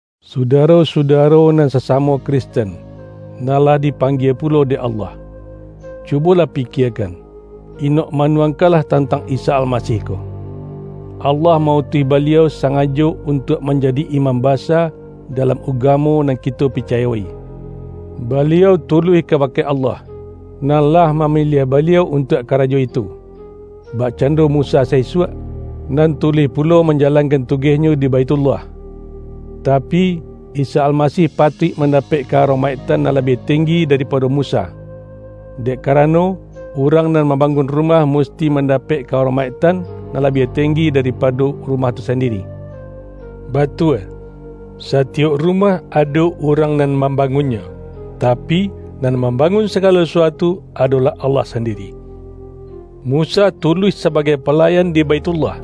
Sudaro-sudaro nan sasamo Kristen, nan lah dipanggie pulo dek Allah! Cubolah pikiekan, inok manuang-kanlah tantang Isa Almasih ko! Allah ma-utuih Baliau, sangajo untuak manjadi Imam Basa dalam ugamo nan kito picayo-i. Baliau tuluih ka-bake Allah, nan lah mamiliah Baliau untuak karajo itu, bakcando Musa sa-isuak, nan tuluih pulo manjalan-kan tugehnyo di Baithullah. Tapi, Isa Almasih patuik mandapek ka-aromaiktan nan labiah tenggi da-ripado Musa. Dek karano, urang nan mambangun rumah musti man-dapek ka-aromaiktan nan labiah tenggi daripado rumah tu sandiri. Batua, satiyok rumah ado urang nan mambangunnyo, tapi, nan mam-bangun sagalo sasuatu adolah Allah sandiri. Musa tuluih sabagai pala-yan di Baithullah,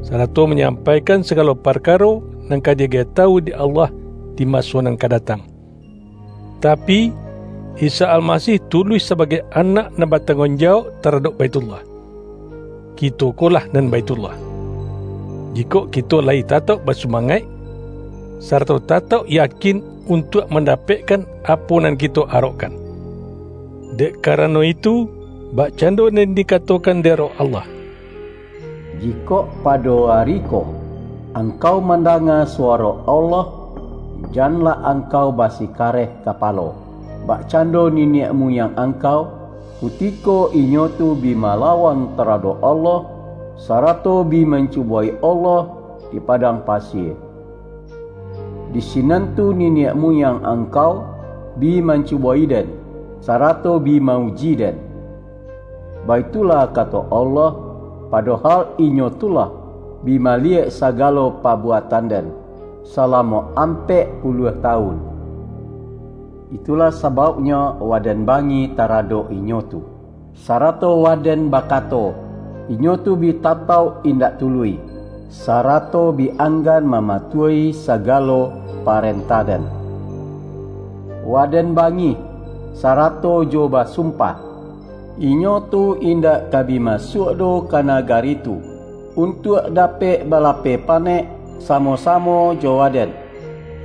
sarato manyam-paikan sagalo parkaro nan ka di-agiah tawu dek Allah di maso nan ka datang. Tapi, Isa Almasih tu-luih sabagai Anak nan batangguang jawauk taradok Baithullah. Kito ko lah nan Baithullah, jikok kito la-yi tatauk basumangaik, sarato ta-tauk yakin untuak mandapekkan apo nan kito arokkan. Dek karano itu, bakcando nan di-katokan dek Roh Allah,”Jikok pado ari ko angkau mandanga suwaro Allah, janlah angkau basikareh kapalo, bakcando niniak muyang angkau, kutiko inyo tu bi malawan taradok Allah, sarato bi mancubo-i Allah di padang pasie. ’Di sinan tu niniak muyang angkau bi mancubo-i Den, sarato bi ma-uji Den,' baitulah kato Allah, ’padohal inyo tu lah bi maliyek sagalo pabuatan Den, salamo ampek puluah tawun.’ Itulah sabauknyo Waden bangih taradok inyo tu, sarato Waden bakato, ’Inyo tu bi tatauk indak tuluih, sarato bi anggan mamatuahi sagalo parentah-Den.’ Waden bangih sarato jo basumpah, ’Inyo tu indak ka bi masuak doh ka nagari tu, untuak dapek balapeh panek samo-samo jo Waden.’”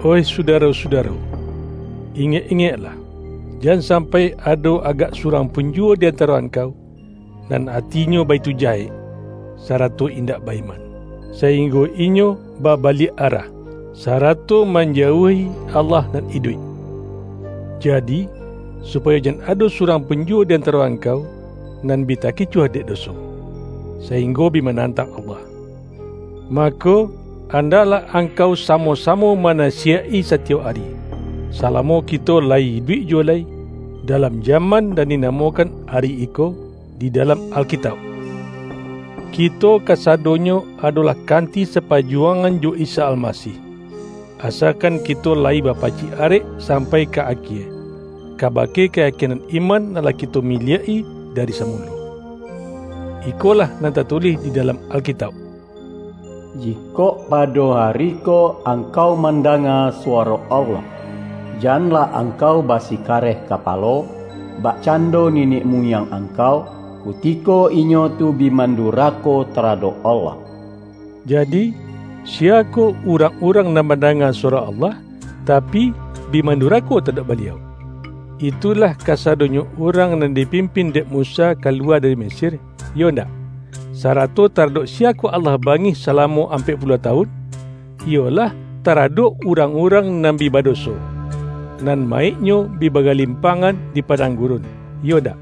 Oih sudaro-sudaro, ingek-ingek-lah, jan sampai ado agak surang pun juwo di antaro angkau, nan atinyo baitu jahek, sarato indak ba-iman, sa-inggo inyo babaliak arah, sarato man-jauahi Allah nan iduik! Jadi, supa-yo jan ado surang pun juwo di antaro angkau nan bi takicuah dek doso, sa-inggo bi manantang Allah, mako, an-daklah angkau samo-samo manasi-yaik-i satiyok ari, salamo kito layi iduik juwo lai, dalam jaman nan di-namokan”Ari Iko” di dalam Alkitauk. Kito kasadonyo adolah kanti sapa-juwangan jo Isa Almasih, asakan kito layi bapacik arek sampai ka akie, ka-bake kayakinan iman nan lah kito mi-liak-i dari samulo. Ikolah nan tatulih di dalam Alkitauk,”Jikok pado ari ko angkau mandanga suwaro Allah, janlah angkau basikareh kapalo, bakcando niniak muyang angkau, kutiko inyo tu bi mandurako taradok Allah.” Jadi, siyakoh urang-urang nan mandanga suwaro Allah, tapi, bi man-durako taradok Baliau? Itulah kasado-nyo urang nan dipimpin dek Musa ka-luwa dari Mesir, iyo ndak? Sarato taradok siyakoh Allah bangih salamo ampek puluah tawun? Iyolah, taradok urang-urang nan bi badoso, nan ma-yiknyo bi bagalimpangan di padang gurun, iyo ndak?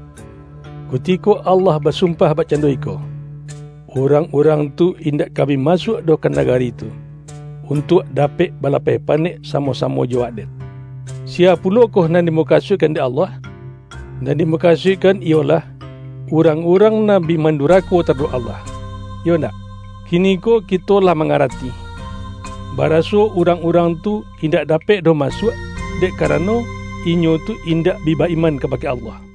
Kutiko Allah ba-sumpah bakcando iko,”Urang-urang tu indak ka bi masuak doh ka naga-ri tu, untuak dapek balapeh panek sa-mo-samo jo Waden” — siya pulokoh nan dimukasuikkan dek Allah? Nan dimukasuikkan iyolah, urang-urang nan bi mandurako taradok Allah, iyo ndak? Kiniko kito lah mangarati, baraso urang-urang tu indak dapek doh masuak, dek karano, inyo tu in-dak bi ba-iman kabake Allah.